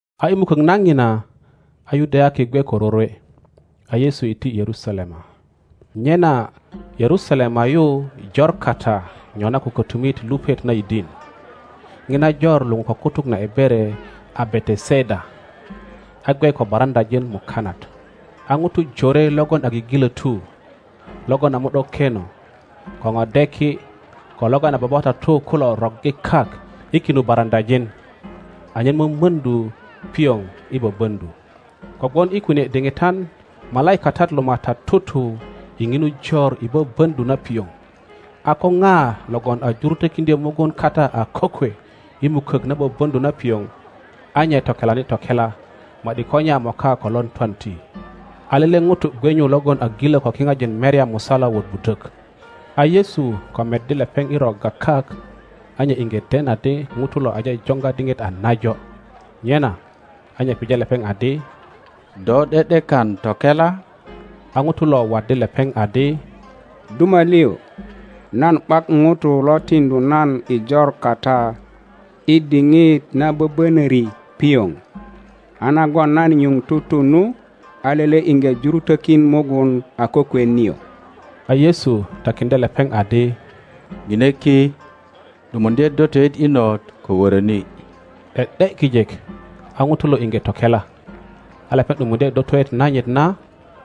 A i mukök na ŋina, a Yudayaki gwe ko rorwe, a Yesu iti Yerusalema. Nyena Yerusalema yu jor kata nyona ko kötumit lupet na yidin. Ŋina jor luŋu ko kutuk na Ebere a Beteseda, a gwe ko baraŋöajin mukanat. A ŋutu jore logon a gigilötu, logon a mo ’do-keno, ko ŋodeki ko logon a babatatu kulo roggi kak i kinu baraŋöajin, [anyen mömöŋdu pioŋ i böböŋdu. Kogwon i kunie diŋitan malaikatat lo MATAT tutu i ŋinu jor i böböŋdu na pioŋ, a ko ŋa logon a jurutökiŋdyö mugun kata a kokwe i mukök na böböŋdu na pioŋ, a nye tokelani tokela ma ’di ko nye a moka ko lon twanti.] A lele ŋuto gwe nyu logon a gilö ko kiŋajin merya musala wot budök. A Yesu ko meddi lepeŋ i rogga kak, a nye iŋge den adi ŋuto lo aje joŋga diŋit a najo, nyena a nye pije lepeŋ adi, Do ’de ’dekan tokela? A ŋuto lo waddi lepeŋ adi, Duma lio, nan ’bak ŋuto lo tiŋdu nan i jor kata i diŋit na böbönöri pioŋ, a nagon nan nyuŋ tutu nu, a lele iŋge jurutökin mugun a kokwe nio. A Yesu takiŋdye lepeŋ adi, ŋine ki, ’dumuŋdye dotoet inot, ko wöröni. ’De ’de kijek a ŋuto lo iŋge tokela, a lepeŋ ’dumuŋdye dotoet nanyit na,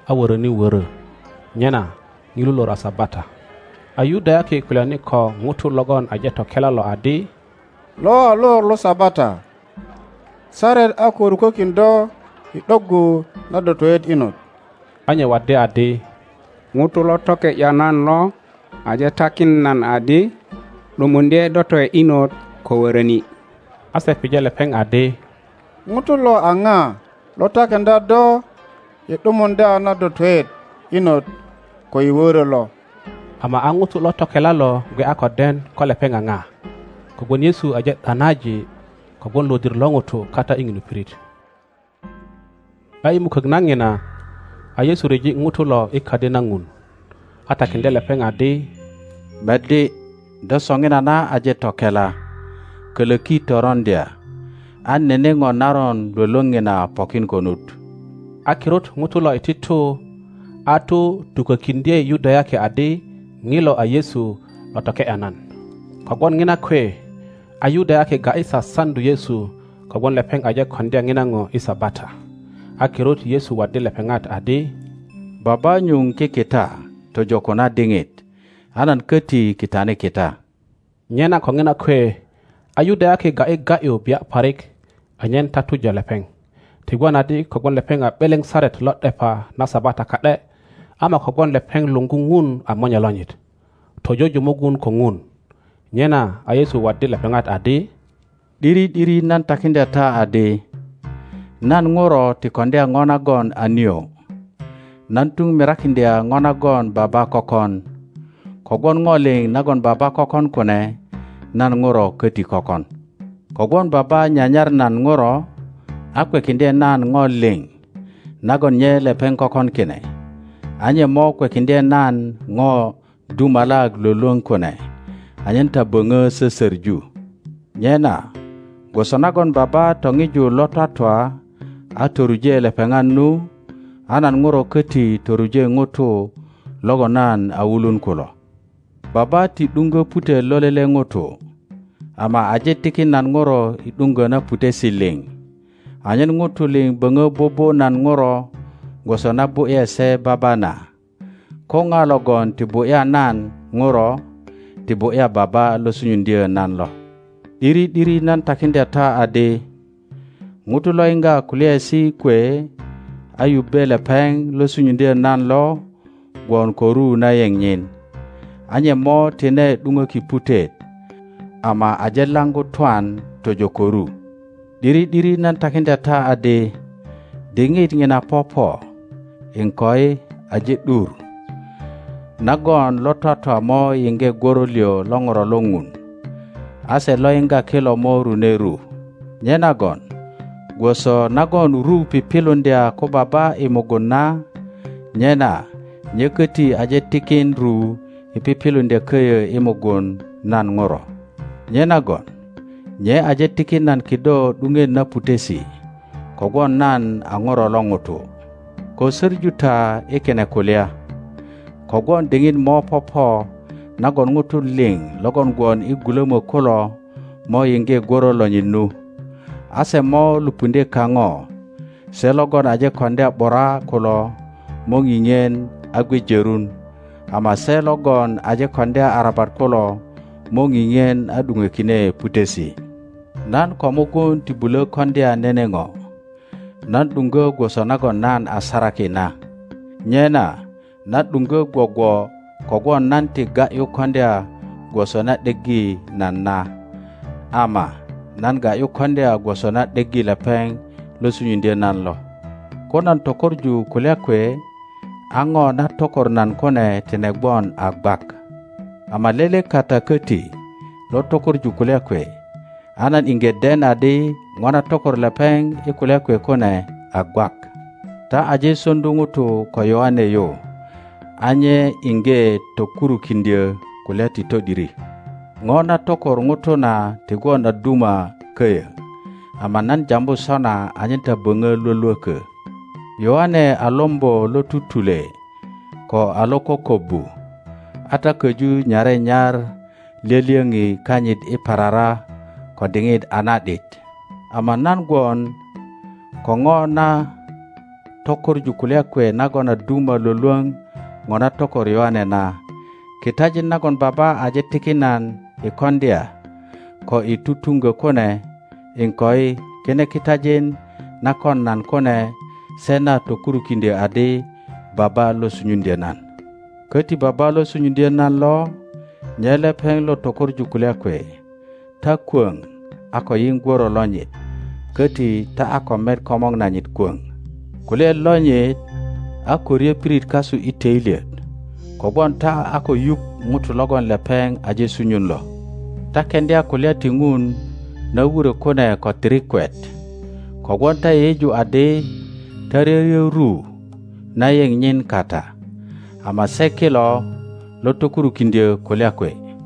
a wöröni wörö. Nyena ŋilu lor a Sabata. A Yudayaki kulyani ko ŋuto logon aje tokela lo adi, Lo a lor lo Sabata; saret a ko rukokin do i ’doggu na dotoet inot. A nye waddi adi, Ŋuto lo toke ’ya nan lo aje takin nan adi, ’Dumuŋdye dotoet inot ko woroni. A se pije lepeŋ adi, Ŋuto lo a ŋa lo takiŋdya do i ’dumuŋdya na dotoet inot ko i woro lo? Ama a ŋuto lo tokela lo gwe a ko den ko lepeŋa ŋonaa, kogwon Yesu aje ’danaji kogwon lodir lo nulu kata i ŋinu pirit. A i mukok na Ŋina, a Yesu ryeji ŋutolo i Kadi na Ŋun, atakiŋdye lepeŋadi, Meddi, do soŋinana aje tokela; koloki toroŋdya, an nene po naron Iwolwoŋ nina pokin konut. A kirut ŋuto lo iti tu a tu tukokiŋdye Yudayaki adi, Ŋilo a Yesu lo toke ’ya nan. Kogwon ŋina kwe a Yudayaki ga ’yi sasaŋdu Yesu kogwon lepeŋ aje koŋdya ŋina po i Sabata. A kirut Yesu waddi lepeŋat adi, Baba nyuŋ kikita tojo ko na diŋit, a nan koti kitani kita. Nyena ko ŋina kwe a Yudayaki ga ’yi ga ’yu bia parik anyen tatuja lepeŋ, ti gwon adi kogwon lepeŋ a ’beleŋ saret lo ’depa na Sabata ka ’de, ama kogwon lepeŋ luŋgu Ŋun a Monye lonyit, tojoju mugun ko Ŋun. Nyena a Yesu waddi lepeŋat adi, ’Diri ’diri nan takiŋdya ta adi, nan Ŋuro ti koŋdya ŋo nagon a nio; nan tuŋ mirakiŋdya ŋo nagon Baba kökon; kogwon ŋo liŋ nagon Baba kökon kune nan Ŋuro koti kökon. Kogwon Baba nyanyar nan Ŋuro, a kwekiŋdye nan ŋo liŋ nagon nye lepeŋ kökon kine; a nye mo kwekiŋdye nan ŋo dumalak Iwolwoŋ kune, anyen ta boŋo sosoŋu. Nyena gwoso nagon Baba toŋiju lo twatwa, a toruje lepeŋat nu, a nan Ŋuro koti toruje ŋutu logon nan a wulun kulo. Baba ti ’duŋgo putet lo lele ŋuto, ama aje tikin nan Ŋuro i ’duŋgo na putesi liŋ, anyen ŋutu liŋ boŋo bubu nan Ŋuro, gwoso na bu ’ye se Baba na. Ko ŋa logon ti bu ’ya nan Ŋuro ti bu ’ya Baba lo sunyuŋdyo nan lo. ’Diri ’diri nan takiŋdya ta adi, Ŋuto lo yiŋga kulyaesi kwe, a yubbe lepeŋ lo sunyuŋdyo nan lo, gwon ko ru na yeŋ nyin, a nye mo tine ’duŋoki putet, ama aje laŋgu twan tojo ko ru. ’Diri ’diri, nan takiŋdya ta adi, diŋit ŋina popo, iŋkoi aje ’dur, nagon lo twatwa mo yiŋge gworo liŋ lo Ŋuro lo Ŋun; a se lo yiŋga kilo mo rune ru. Nyenagon gwoso nagon ru piŋiluŋdya ko Baba i mugun na, nyena nye koti aje tikin ru i piŋiluŋdya koyo i mugun nan Ŋuro. Nyenagon nye aje tikin nan kido ’duŋet na putesi, kogwon nan a Ŋuro lo ŋuto. Ko soŋu ta i kine kulya, kogwon diŋit mo popo nagon ŋutu liŋ logon gwon i gulomo kulo mo yiŋge gworo lonyit nu, a se mo lupuŋdye kaŋo, se logon aje koŋdya ’bura kulo mo ŋiŋisu a gwe jorun, ama se logon aje koŋdya arabat kulo mo ŋiŋien a ’duŋo kine putesi. Nan ko mugun ti bulo koŋdya nene ŋo, nan ’duŋgo gwoso nagon nan a saraki na, nyena nan ’duŋgo gwogwo kogwon nan ti ga ’yu koŋdya gwoso na ’deggi nan na, ama nan ga ’yu koŋdya gwoso na ’deggi lepeŋ lo sunyuŋdyo nan lo. Ko nan tökoŋu kulya kwe, a ŋo na tokor nan kune tine gwon a gwak. Ama lele kata kbti lo tökoŋu kulya kwe, a nan iŋge den adi ŋo na tokor lepeŋ i kulya kwe kune a gwak. Ta aje soŋdu ŋutu ko Yoŋe yu, a nye iŋge tokurukiŋdyo kulya ti to ’diri. na tokor ŋuto na ti gwon a duma koyo, ama nan jambu sona anyen ta boŋo Iwolwoko. Yöaŋe a lombo lo tutule ko a lo kokobbu, a ta koju nyare nyar lyolyoŋi kanyit i parara ko diŋit a na ’dit. Ama nan gwon ko ŋo na tökoŋu kulya kwe nagon a duma Iwolwoŋ ŋo na tokor Yoŋe na. Kitajin nagon Baba aje tikin nan i koŋdya ko i tutuŋgo kune, iŋkoi, kine kitajin na kon nan kune se na tokurukiŋdyo adi Baba lo sunyuŋdyo nan. Koti Baba lo sunyuŋdyo nan lo, nye lepeŋ lo tökoŋu kulya kwe. Ta kwoŋ a ko yiŋ gworo lonyit, koti ta a ko met komor nanyit kwoŋ. Kulyaet lonyit a ko ryo pirit kasui toilyet, kogwon ta a ko yuŋ Ŋuto logon lepeŋ aje sunyun lo. Ta keŋdya kulya ti Ŋun na wuro kune ko tirikwet kogwon ta yeyeju adi ta ryoryo ru na yeŋ nyin kata, ama se kilo lo tokurukindyo kulya kwe;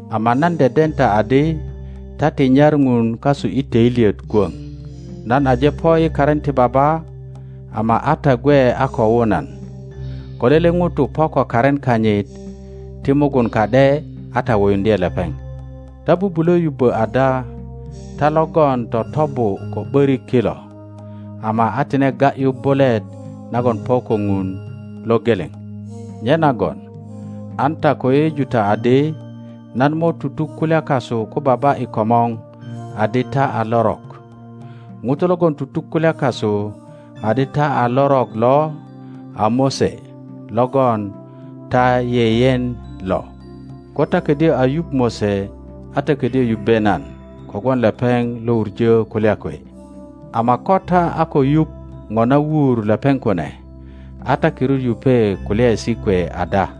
ama nan deden ta adi ta ti nyar Ŋun kasu i toilyet kwoŋ. Nan aje po i karin ti Baba, ama a ta gwe a ko wu nan. Ko lele ŋuto po ko karin kanyit ti mugun ka ’de, a ta wuyuŋdye lepeŋ. Ta bubulo yubbo ada ta logon totobu ko ’borik kilo, ama a tine ga ’yu bulet nagon po ko Ŋun lo geleŋ? Nyenagon an ta ko yeyeju ta adi nan mo tutuk kulya kasu ko Baba i komor adi ta a lorok. ŋuto logon tutuk kulya kasu adi ta a lorok lo a Mose logon ta yeyen lo. Ko ta kodyo a yuŋ Mose, a ta kodyo yubbe nan, kogwon lepeŋ lo wuŋo kulya kwe. Ama ko ta a ko yuŋ ŋo na wur lepeŋ kune, a ta kirut yupe kulyaesi kwe ada?